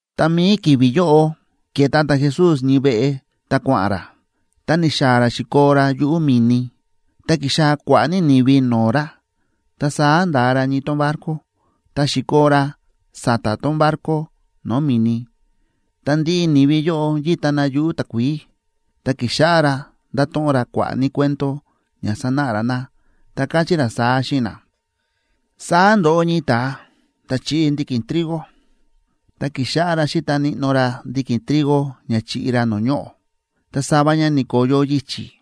Ta mi̱i ki̱vi̱ yóꞌo ke̱ta ta̱Jesús ñii veꞌe ta kua̱ꞌa̱n ra, ta ni̱xaa̱ ra xi̱koo ra yuꞌu̱ mi̱ni. Ta ki̱xaa̱ kua̱ꞌa̱ ní ni̱vi no̱o̱ ra, ta saá nda̱a ra ñii tón barco ta xi̱koo ra sa̱ta̱ tón barco no̱o̱ mi̱ni, ta ndiꞌi ni̱vi yóꞌo yíta na yuꞌu̱ takuií. Ta ki̱xáꞌá ra ndáto̱ꞌon ra kua̱ꞌa̱ ní cuento ña sanáꞌa ra na, ta káchí ra saá xíꞌin na: ―Saá ndo̱ꞌo ñii ta̱a ta̱ chíꞌi ndiki̱n trigo. Ta ki̱xáꞌá ra xíta níꞌnó ra ndiki̱n trigo ña chiꞌi ra no̱o̱ ñoꞌo̱. Ta sava ña ni̱ko̱yo yichi̱,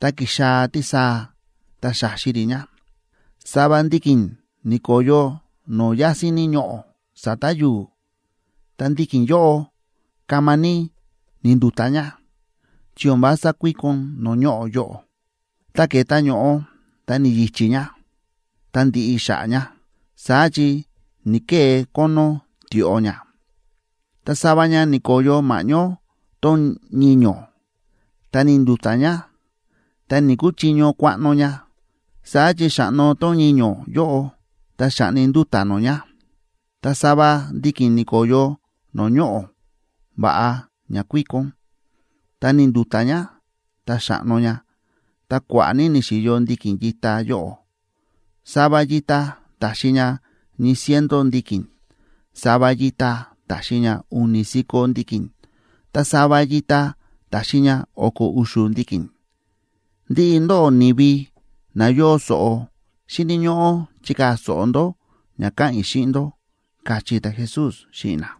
ta ki̱xaa̱ tísaa ta xa̱xi rí ña. Sava ndiki̱n ni̱ko̱yo no̱o̱ yásín ní ñoꞌo̱ sa̱ta̱ yu̱u̱, ta ndiki̱n yóꞌo kama ní ni̱ndu̱ta̱ ña, chi o̱n vása kuíkon no̱o̱ ñoꞌo̱ yóꞌo. Ta ke̱ta ño̱ꞌo ta ni̱yichí ña, ta ndi̱ꞌi xa̱ꞌa̱ ña, saá chi ni̱‑kee kónó tioꞌo ña. Ta sava ña ni̱ko̱yo ma̱ꞌñó tón ñiño̱, ta ni̱ndu̱ta̱ ña, ta ni̱‑kuchiño kuaꞌno ña, saá chi xa̱ꞌno tón ñiño̱ yóꞌo ta xa̱ꞌni nduta̱ nó ña. Ta sava ndiki̱n ni̱ko̱yo no̱o̱ ñoꞌo̱ va̱ꞌa ña kuíkon. Ta ni̱ndu̱ta̱ ña, ta xa̱ꞌno ña, ta kua̱ꞌa̱ ní ni̱xi̱yo ndiki̱n yita yóꞌo. Sava yita ta̱xi ña ñii ciento ndiki̱n, sava yita ta̱xi ña u̱ni̱ si̱ko̱ ndiki̱n, ta sava yita ta̱xi ña o̱ko̱ u̱xu̱ ndiki̱n. Ndiꞌi ndóꞌó ni̱vi na yóo so̱ꞌo, xíni̱ ñóꞌó chikaa̱ so̱ꞌo ndó ña káꞌa̱n i̱ xíꞌin ndó ―káchí ta̱Jesús xíꞌin na.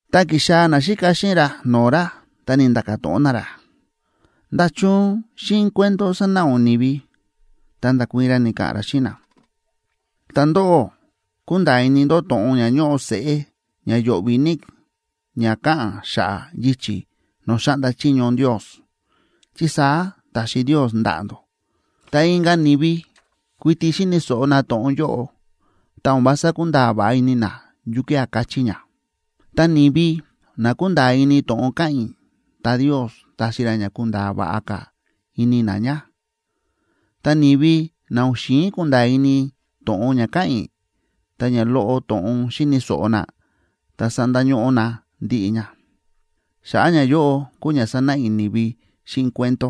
Ta ki̱xaa̱ naxíka xíꞌin ra no̱o̱ ra, ta ni̱nda̱ka̱ to̱ꞌon na ra: ―¿Nda̱chun xíꞌin cuento sánáꞌa ún ni̱vi? Ta nda̱kuii̱n ra, ni̱ka̱ꞌa̱n ra xíꞌin na: ―Ta ndóꞌó, kúnda̱a̱ ini ndó to̱ꞌon ña ñóꞌo seꞌé ña yo̱ꞌvi̱ ní ña káꞌa̱n xa̱ꞌa̱ yichi̱ no̱o̱ xáꞌnda chiño Ndios, chi saá ta̱xi Ndios ndaꞌa̱ ndó. Ta inka̱ ni̱vi kuiti xíni̱ so̱ꞌo na to̱ꞌon yóꞌo, ta o̱n vása kúnda̱a̱ va̱ꞌa ini na yukía̱ káchí ña. Ta ni̱vi na kúnda̱a̱ ini to̱ꞌon káꞌa̱n i̱, ta Ndios taxi ra ña kunda̱a̱ va̱ꞌa ka̱ ini na ña, ta ni̱vi na o̱n xi̱in kunda̱a̱ ini to̱ꞌon ña káꞌa̱n i̱, ta ña loꞌo to̱ꞌon xi̱ni̱ so̱ꞌo na ta sandañóꞌó na ndiꞌi ña. Xa̱ꞌa̱ ñayóꞌo kúu ña sánáꞌa i̱ ni̱vi xíꞌin cuento: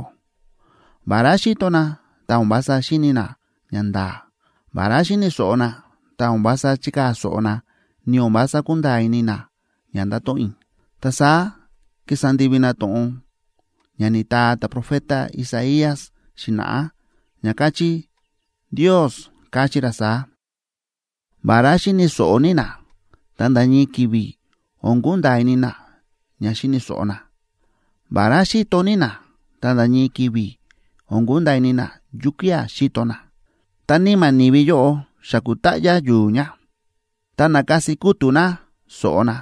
Vará xíto na, ta o̱n vása xíni̱ na ñanda̱a̱. Vará xíni̱ so̱ꞌo na, ta o̱n vása chíkaa̱ so̱ꞌo na, ni o̱n vása kúnda̱a̱ ini na ña ndáto̱ꞌon i̱. Ta saá kísa ndivi na to̱ꞌon ña ni̱taa ta̱profeta Isaías xi̱na̱ꞌá, ña káchí: Ndios káchí ra saá: “Vará xíni̱ so̱ꞌo ní na, ta nda̱ ñii ki̱vi̱ o̱n kunda̱a̱ ini na ña xíni̱ so̱ꞌo na. Vará xíto ní na, ta nda̱ ñii ki̱vi̱ o̱n kunda̱a̱ ini na yukía̱ xíto na. Ta níma̱ ni̱vi yóꞌo xa ku̱táꞌyá yu̱u̱ ña. Ta nákasi kútu̱ na so̱ꞌo na,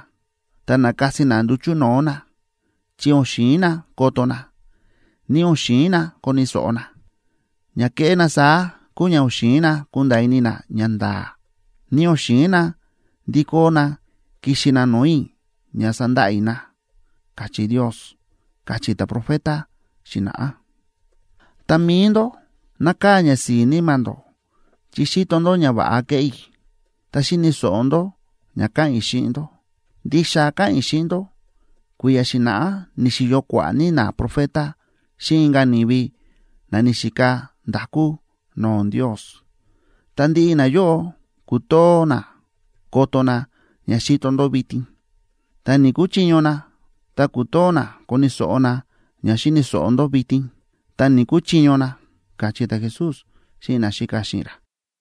ta nákasi na nduchu̱ no̱o̱ na, chi o̱n xi̱in na koto na, ni o̱n xi̱in na koni̱ so̱ꞌo na. Ña kéꞌé na saá kúu ña o̱n xi̱in na kunda̱a̱ ini na ñanda̱a̱, ni o̱n xi̱in na ndikó na kixi na no̱o̱ i̱ ña sandaꞌa i̱ na”, káchí Ndios, káchí ta̱profeta xi̱na̱ꞌá. ’Ta mi̱i ndó, nákaa̱ ñasi̱i̱ níma̱ ndó chi xíto ndó ñava̱ꞌa kéꞌé i̱, ta xíni̱ so̱ꞌo ndó ña káꞌa̱n i̱ xíꞌin ndó. Ndixa káꞌa̱n i̱ xíꞌin ndó, kui̱ya̱ xi̱na̱ꞌá ni̱xi̱yo kua̱ꞌa̱ ní naprofeta xíꞌin inka̱ ni̱vi na ni̱xika nda̱kú no̱o̱ Ndios, ta ndiꞌi nayóꞌo ku̱too na koto na ña xíto ndó vitin, ta ni̱‑kuchiño na, ta ku̱too na koni̱ so̱ꞌo na ña xíni̱ so̱ꞌo ndó vitin, ta ni̱‑kuchiño na ―káchí ta̱Jesús xíꞌin naxíka xíꞌin ra.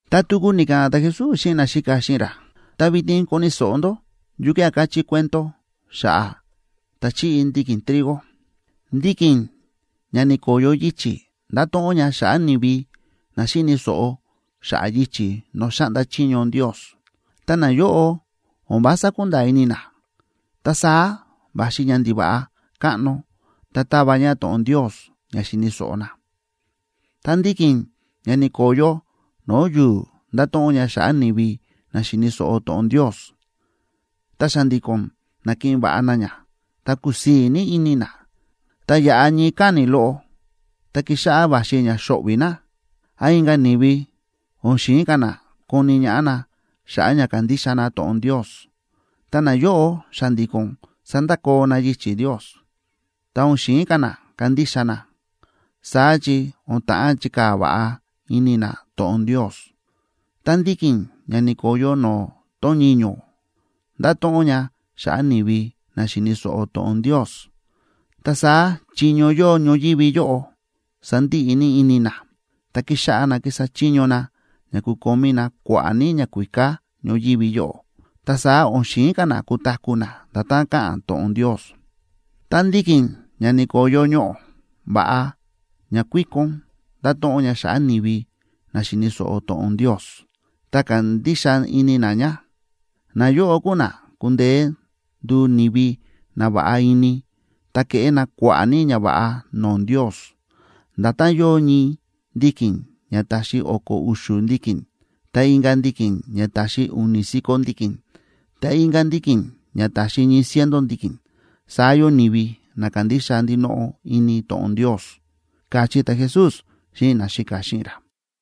Ta tuku ni̱ka̱ꞌa̱n ta̱Jesús xíꞌin naxíka xíꞌin ra: ―Ta vitin koni̱ so̱ꞌo ndó yukía̱ káchí cuento xa̱ꞌa̱ ta̱ chíꞌi ndiki̱n trigo. Ndiki̱n ña ni̱ko̱yo yichi̱ ndáto̱ꞌon ña xa̱ꞌa̱ ni̱vi na xíni̱ so̱ꞌo xa̱ꞌa̱ yichi̱ no̱o̱ xáꞌnda chiño Ndios, ta nayóꞌo o̱n vása kúnda̱a̱ ini na, ta saá va̱xi ñandiva̱ꞌa káꞌno ta táva ña to̱ꞌon Ndios ña xi̱ni̱ so̱ꞌo na. Ta ndiki̱n ña ni̱ko̱yo no̱o̱ yu̱u̱ ndáto̱ꞌon ña xa̱ꞌa̱ ni̱vi na xíni̱ so̱ꞌo to̱ꞌon Ndios, ta xa̱ndi̱ko̱n nákiꞌin va̱ꞌa na ña, ta kúsii̱ ní ini na. Ta yáꞌa ñii káni̱ loꞌo, tá kíxáꞌá va̱xi ña xóꞌvi̱ na, án inka̱ ni̱vi o̱n xi̱in ka̱ na koni ñaꞌá na xa̱ꞌa̱ ña kándixa na to̱ꞌon Ndios, ta nayóꞌo xa̱ndi̱ko̱n sándakoo na yichi̱ Ndios, ta o̱n xi̱in ka̱ na kandixa na, saá chi o̱n ta̱ꞌán chikaa̱ va̱ꞌa ini na to̱ꞌon Ndios. Ta ndiki̱n ña ni̱ko̱yo no̱o̱ tón ñiño̱ ndáto̱ꞌon ña xa̱ꞌa̱ ni̱vi na xíni̱ so̱ꞌo to̱ꞌon Ndios. Ta saá chiño yóo ñoyívi yóꞌo sándiꞌi ní ini na, ta kíxáꞌá na kísa chiño na ña kukomí na kua̱ꞌa̱ ní ñakuíká ñoyívi yóꞌo, ta saá o̱n xi̱in ka̱ na kutaku̱ na nda̱tán káꞌa̱n to̱ꞌon Ndios. Ta ndiki̱n ña ni̱ko̱yo ñoꞌo̱ va̱ꞌa ña kuíkon ndáto̱ꞌon ña xa̱ꞌa̱ ni̱vi na xíni̱ so̱ꞌo to̱ꞌon Ndios, ta kándixa ini na ña. Nayóꞌo kúu na kúndeé nduu ni̱vi na va̱ꞌa ini ta keꞌé na kua̱ꞌa̱ ní ñava̱ꞌa no̱o̱ Ndios. Nda̱tán yóo ñii ndiki̱n ña taxi o̱ko̱ u̱xu̱ ndiki̱n, ta inka̱ ndiki̱n ña taxi u̱ni̱ si̱ko̱ ndiki̱n, ta inka̱ ndiki̱n ña taxi ñii ciento ndiki̱n, saá yóo ni̱vi na kándixa ndinoꞌo ini to̱ꞌon Ndios ―káchí ta̱Jesús xíꞌin naxíka xíꞌin ra.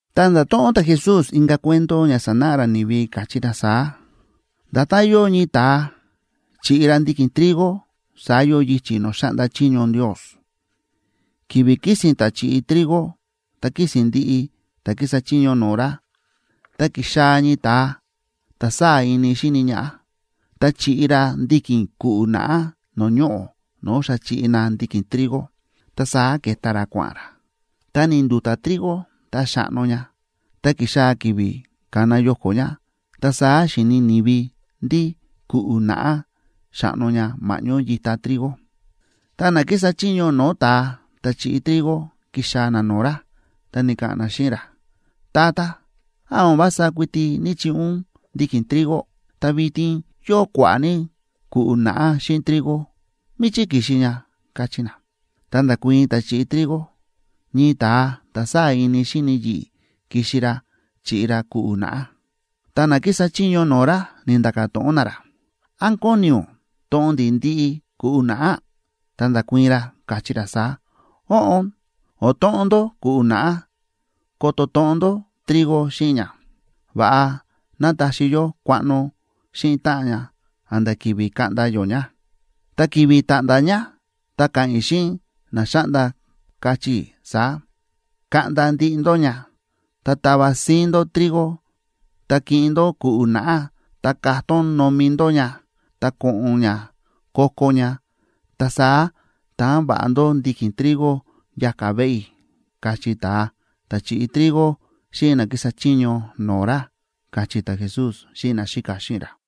Ta nda̱to̱ꞌon ta̱Jesús inka̱ cuento ña sanáꞌa ra ni̱vi, káchí ra saá: ―Nda̱tán yóo ñii ta̱a chíꞌi ra ndiki̱n trigo, saá yóo yichi̱ no̱o̱ xáꞌnda chiño Ndios. Ki̱vi̱ kísi̱n ta̱ chi̱ꞌi trigo ta kísi̱n ndiꞌi ta̱ kísa chiño no̱o̱ ra, ta ki̱xaa̱ ñii ta̱a ta̱ sáa̱ ini xíni ñaꞌá, ta chi̱ꞌi ra ndiki̱n ku̱ꞌu̱ naꞌá no̱o̱ ñoꞌo̱ no̱o̱ xa chi̱ꞌi na ndiki̱n trigo, ta saá ke̱ta ra kua̱ꞌa̱n ra. Ta ni̱ndu̱ta̱ trigo ta xa̱ꞌno ña, ta ki̱xaa̱ ki̱vi̱ kána yoko̱ ña, ta saá xíni ni̱vi ndí ku̱ꞌu̱ naꞌá xáꞌno ña ma̱ꞌñó yita trigo. Ta na kísa chiño no̱o̱ ta̱a ta̱ chi̱ꞌi trigo ki̱xaa̱ na no̱o̱ ra, ta ni̱ka̱ꞌa̱n na xíꞌin ra: “Tata, ¿án o̱n vása kuiti ní‑chiꞌi ún ndiki̱n trigo? Ta vitin yóo kua̱ꞌa̱ ní ku̱ꞌu̱ naꞌá xíꞌin trigo. ¿Míchí ki̱xi ña?”, káchí na. Ta nda̱kuii̱n ta̱ chi̱ꞌi trigo: “Ñii ta̱a ta̱ sáa̱ ini xíni yi̱ꞌi̱ ki̱xi ra chi̱ꞌi ra ku̱ꞌu̱ naꞌá.” Ta na kísa chiño no̱o̱ ra ni̱nda̱ka̱ to̱ꞌon na ra: “¿Án kóni ún toꞌon ndi̱ ndiꞌi ku̱ꞌu̱ naꞌá?” Ta nda̱kuii̱n ra, káchí ra saá: “Óꞌon, o̱n toꞌon ndó ku̱ꞌu̱ naꞌá ko̱to̱ toꞌon ndó trigo xíꞌin ña. Va̱ꞌa ná taxi yó kuaꞌno xíꞌin táꞌan ña a̱nda̱ ki̱vi̱ kaꞌnda yó ña. Ta ki̱vi̱ ta̱ꞌnda̱ ña ta ka̱ꞌa̱n i̱ xíꞌin na xáꞌnda, kachí i̱ saá: Kaꞌnda ndiꞌi ndó ña, ta tava síín ndó trigo, ta kiꞌin ndó ku̱ꞌu̱ naꞌá, ta katón nomi ndó ña ta ko̱ꞌo̱n ña ko̱ko̱ ña; ta saá taan va̱ꞌa ndó ndiki̱n trigo yaka̱ veꞌe i̱”, kachí ta̱a ta̱ chi̱ꞌi trigo xíꞌin na kísa chiño no̱o̱ ra ―káchí ta̱Jesús xíꞌin naxíka xíꞌin ra.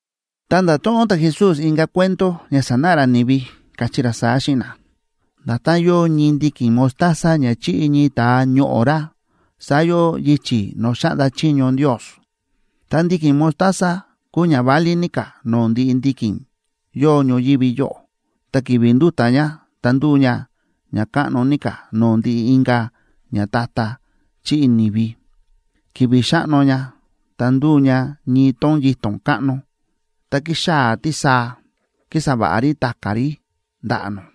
Ta nda̱to̱ꞌon ta̱Jesús inka̱ cuento ña sanáꞌa ra ni̱vi, káchí ra saá xíꞌin na: ―Nda̱tán yóo ñii ndiki̱n mostaza ña chi̱ꞌi ñii ta̱a ñoꞌo̱ ra, saá yóo yichi̱ no̱o̱ xáꞌnda chiño Ndios. Ta ndiki̱n mostaza kúu ña válí ní ka̱ no̱o̱ ndiꞌi ndiki̱n yóo ñoyívi yóꞌo, ta ki̱vi̱ ndúta̱ ña ta ndúu ña ña káꞌno ní ka̱ no̱o̱ ndiꞌi inka̱ ñata̱ta̱ chíꞌi ni̱vi. Ki̱vi̱ xa̱ꞌno ña, ta ndu̱u ña ñii tón yito̱n káꞌno, ta kíxaa̱ tísaa kísa va̱ꞌa rí ta̱ka̱ rí ndaꞌa̱ nó.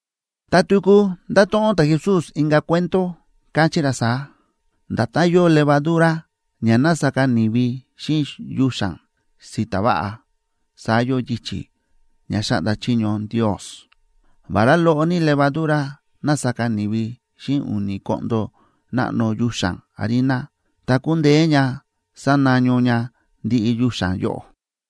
Ta tuku nda̱to̱ꞌon ta̱Jesús inka̱ cuento, káchí ra saá: ―Nda̱tán yóo levadura ña na̱saka ni̱vi xíꞌin yuxa̱n si̱ta̱ váꞌa, saá yóo yichi̱ ña xáꞌnda chiño Ndios. Vará loꞌo ní levadura na̱saka ni̱vi xíꞌin u̱ni̱ koꞌndo náꞌno yuxa̱n harina, ta ku̱ndeé ña sanaño ña ndiꞌi yuxa̱n yóꞌo.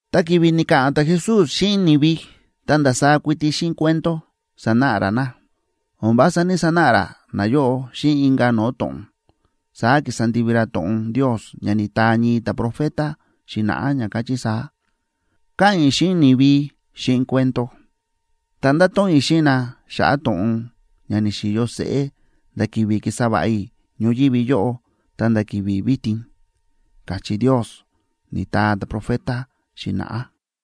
Ta ki̱vi̱ ni̱ka̱ꞌa̱n ta̱Jesús xíꞌin ni̱vi, ta ndasaá kuiti xíꞌin cuento sa̱náꞌa ra na; o̱n vása ní‑sanáꞌa ra nayóꞌo xíꞌin inka̱ no̱o̱ to̱ꞌon. Saá ki̱sa ndivi ra to̱ꞌon Ndios ña ni̱taa ñii ta̱profeta xi̱na̱ꞌá, ña káchí saá: Ka̱ꞌa̱n i̱ xíꞌin ni̱vi xíꞌin cuento; ta ndato̱ꞌon i̱ xíꞌin na xa̱ꞌa̱ to̱ꞌon ña ni̱xi̱yo seꞌé nda̱ ki̱vi̱ ki̱sa va̱ꞌa i̱ ñoyívi yóꞌo ta̱nda̱ ki̱vi̱ vitin, káchí Ndios, ni̱taa ta̱profeta xi̱na̱ꞌá.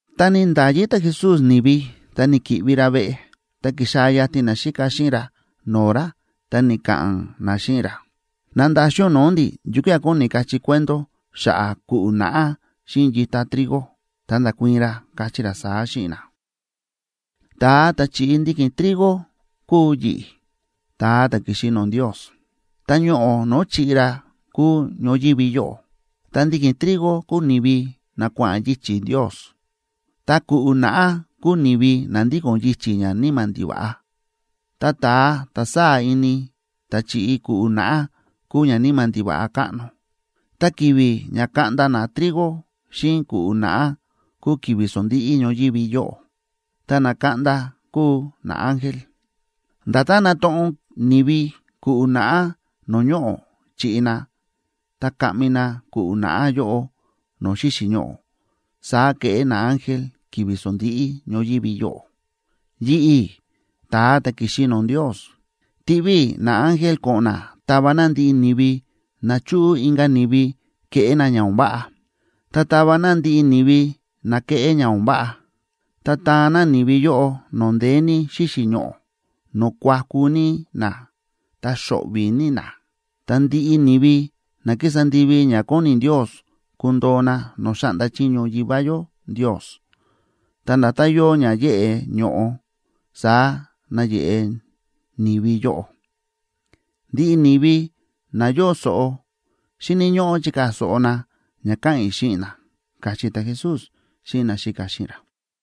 Ta ni̱nda̱yi ta̱Jesús ni̱vi, ta ni̱ki̱ꞌvi ra veꞌe. Ta ki̱xaa̱ yatin naxíka xíꞌin ra no̱o̱ ra, ta ni̱ka̱ꞌa̱n na xíꞌin ra: ―Nandaxin ún no̱o̱ ndi̱ yukía̱ kóni kachí cuento xa̱ꞌa̱ ku̱ꞌu̱ naꞌá xíꞌin yita trigo. Ta nda̱kuii̱n ra, káchí ra saá xíꞌin na: ―Ta̱a ta̱ chi̱ꞌi ndiki̱n trigo kúu yi̱ꞌi̱, ta̱a ta̱ ki̱xi no̱o̱ Ndios. Ta ñoꞌo̱ no̱o̱ chi̱ꞌi ra kúu ñoyívi yóꞌo, ta ndiki̱n trigo kúu ni̱vi na kua̱ꞌa̱n yichi̱ Ndios. Ta ku̱ꞌu̱ naꞌá kúu ni̱vi na ndíko̱n yichi̱ ñaníma̱ ndiva̱ꞌa. Ta ta̱a ta̱ sáa̱ ini ta̱ chi̱ꞌi ku̱ꞌu̱ naꞌá kúu ñaníma̱ ndiva̱ꞌa káꞌno. Ta ki̱vi̱ ña kaꞌnda na trigo xíꞌin ku̱ꞌu̱ naꞌá kúu ki̱vi̱ sondíꞌí ñoyívi yóꞌo, ta na kaꞌnda kúu naángel. Nda̱tán nátoꞌon ni̱vi ku̱ꞌu̱ naꞌá no̱o̱ ñoꞌo̱ chi̱ꞌi na, ta kaꞌmi na ku̱ꞌu̱ naꞌá yóꞌo no̱o̱ xíxi̱ ñoꞌo̱, saá keꞌé naángel ki̱vi̱ sondíꞌí ñoyívi yóꞌo. Yi̱ꞌi̱, ta̱a ta̱ ki̱xi no̱o̱ Ndios, tiꞌví i̱ naángel ko̱ꞌo̱n na tava na ndiꞌi ni̱vi na chúꞌu inka̱ ni̱vi keꞌé na ña o̱n váꞌa, ta tava na ndiꞌi ni̱vi na keꞌé ña o̱n váꞌa. Ta taan na ni̱vi yóꞌo no̱o̱ ndeé ní xíxi̱ ñoꞌo̱, no̱o̱ kuaku ní na ta xo̱ꞌvi̱ ní na. Ta ndiꞌi ni̱vi na kísa ndivi ña kóni Ndios kundoo na no̱o̱ xáꞌnda chiño Yivá yó Ndios, ta nda̱tán yóo ña yéꞌe ño̱ꞌo, saá nayeꞌe ni̱vi yóꞌo. Ndiꞌi ni̱vi na yóo so̱ꞌo, xíni̱ ñóꞌó chikaa̱ so̱ꞌo na ña káꞌa̱n i̱ xíꞌin na ―káchí ta̱Jesús xíꞌin naxíka xíꞌin ra.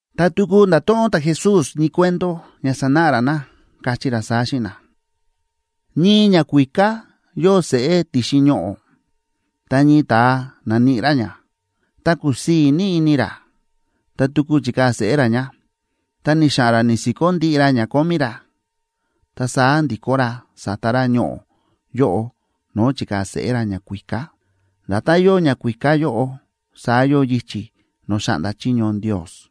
Ta tuku nda̱to̱ꞌon ta̱Jesús ñii cuento ña sanáꞌa ra na, káchí ra saá xíꞌin na: ―Ñii ñakuíká yóo seꞌé ti̱xin ñoꞌo̱, ta ñii ta̱a na̱níꞌi ra ña, ta kúsii̱ ní ini ra, ta tuku chi̱kaa̱ seꞌé ra ña, ta ni̱xa̱ꞌa̱n ra ni̱si̱kó ndiꞌi ra ña kómí ra, ta saá ndi̱kó ra sa̱ta ra ñoꞌo̱ yóꞌo no̱o̱ chi̱kaa̱ seꞌé ra ñakuíká. Nda̱tán yóo ñakuíká yóꞌo, saá yóo yichi̱ no̱o̱ xáꞌnda chiño Ndios.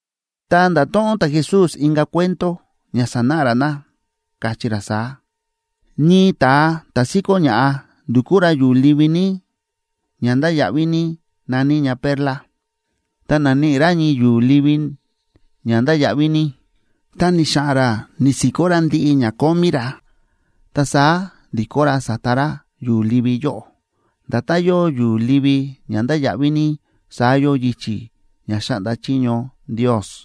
Ta nda̱to̱ꞌon ta̱Jesús inka̱ cuento ña sanáꞌa ra na, káchí ra saá: ―Ñii ta̱a ta̱ síkó ña̱ꞌa ndúkú ra yu̱u̱ livi ní ña ndáya̱ꞌví ní na̱ní ña perla. Ta na̱níꞌi ra ñii yu̱u̱ livi ña ndáya̱ꞌví ní, ta ni̱xa̱ꞌa̱n ra ni̱si̱kó ndiꞌi ra ña kómí ra, ta saá ndi̱kó ra sa̱ta ra yu̱u̱ livi yóꞌo. Nda̱tán yóo yu̱u̱ livi ña ndáya̱ꞌví ní, saá yóo yichi̱ ña xáꞌnda chiño Ndios.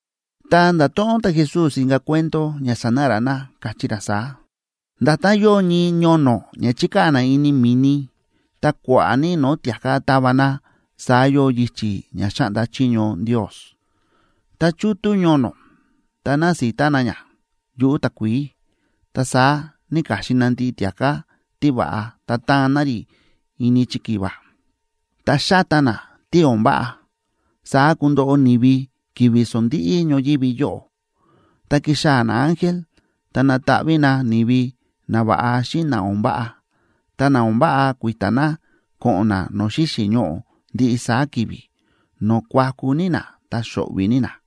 Ta nda̱to̱ꞌon ta̱Jesús inka̱ cuento ña sanáꞌa ra na, káchí ra saá: ―Nda̱tán yóo ñii ñono̱ ña chíkaa̱ na ini mi̱ni, ta kua̱ꞌa̱ ní no̱o̱ tia̱ká táva na, saá yóo yichi̱ ña xáꞌnda chiño Ndios. Tá chútú ñono̱, ta násita na ña yuꞌu̱ takuií. Ta saá náka̱xin na ndiꞌi tia̱ká tíva̱ꞌa ta táan na rí ini chikiva, ta xáta na tí o̱n váꞌa. Saá kundoꞌo ni̱vi ki̱vi̱ sondíꞌí ñoyívi yóꞌo: ta kixaa̱ naángel ta nataꞌví na ni̱vi nava̱ꞌa xíꞌin na o̱n váꞌa, ta na o̱n váꞌa kui̱ta̱ na ko̱ꞌo̱n na no̱o̱ xíxi̱ ñoꞌo̱ ndiꞌi saá ki̱vi̱, no̱o̱ kuaku ní na ta xo̱ꞌvi̱ ní na.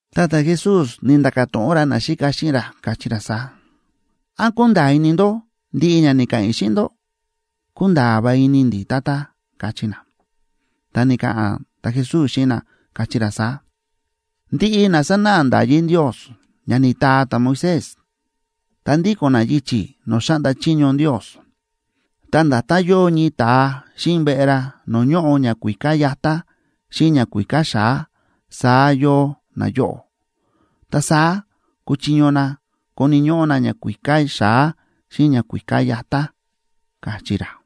Ta ta̱Jesús ni̱nda̱ka̱ to̱ꞌon ra naxíka xíꞌin ra, káchí ra saá: ―¿Án kúnda̱a̱ ini ndó ndiꞌi ña ni̱ka̱ꞌa̱n i̱ xíꞌin ndó? ―Kúnda̱a̱ va̱ꞌa ini ndi̱, Tata ―káchí na. Ta ni̱ka̱ꞌa̱n ta̱Jesús xíꞌin na, káchí ra saá: ―Ndiꞌi na sánáꞌa nda̱yí Ndios ña ni̱taa ta̱Moisés ta ndíko̱n na yichi̱ no̱o̱ xáꞌnda chiño Ndios, ta nda̱tán yóo ñii ta̱a xíꞌin veꞌe ra no̱o̱ ñóꞌo ñakuíká yatá xíꞌin ñakuíká xa̱á, saá yóo nayóꞌo. Ta saá kúchiño na koni̱ ñóꞌó na ñakuíká xa̱á xíꞌin ñakuíká yatá ―káchí ra.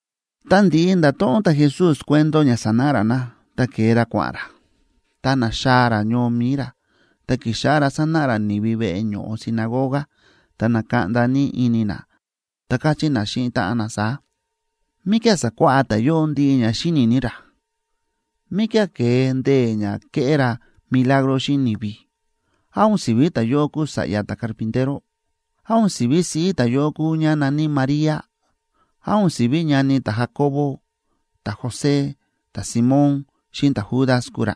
Ta ndi̱ꞌi nda̱to̱ꞌon ta̱Jesús cuento ña sánáꞌa ra na, ta ke̱e ra kua̱ꞌa̱n ra. Ta na̱xaa̱ ra ñoo mi̱i ra, ta ki̱xáꞌá ra sánáꞌa ra ni̱vi veꞌe ño̱ꞌo sinagoga. Ta na̱kaꞌnda ní ini na, ta káchí na xíꞌin táꞌan na saá: ―¿Míkía̱ sa̱kuáꞌá ta̱yóꞌo ndiꞌi ña xíni̱ ní ra? ¿Míkía̱ ke̱e ndee̱ ña kéꞌé ra milagro xíꞌin ni̱vi? ¿Án o̱n si̱ví ta̱yóꞌo kúu sa̱ꞌya ta̱carpintero? ¿Án o̱n si̱ví siꞌí ta̱yóꞌo kúu ñá na̱ní María? ¿Án o̱n si̱ví ñani ta̱Jacobo, ta̱José, ta̱Simón xíꞌin ta̱Judas kúu ra?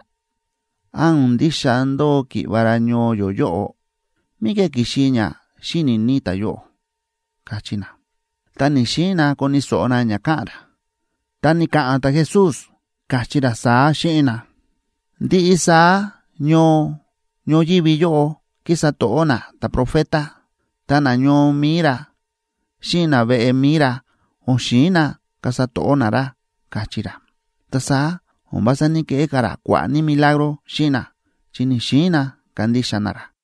¿Án o̱n ndixa ndóo ki̱ꞌva̱ ra ñoo yó yóꞌo? ¿Míkía̱ ki̱xi ña xíni̱ ní ta̱yóꞌo? ―káchí na. Ta ni̱‑xiin na koni̱ so̱ꞌo na ña káꞌa̱n ra. Ta ni̱ka̱ꞌa̱n ta̱Jesús, káchí ra saá xíꞌin na: ―Ndiꞌi saá ñoo ñoyívi yóꞌo kísa to̱ꞌó na ta̱profeta, ta nañoo mi̱i ra xíꞌin naveꞌe mi̱i ra o̱n xi̱in na kasa to̱ꞌó na ra ―káchí ra. Ta saá o̱n vása ní‑keꞌé ra kua̱ꞌa̱ ní milagro xíꞌin na, chi ni̱‑xiin na kandixa na ra.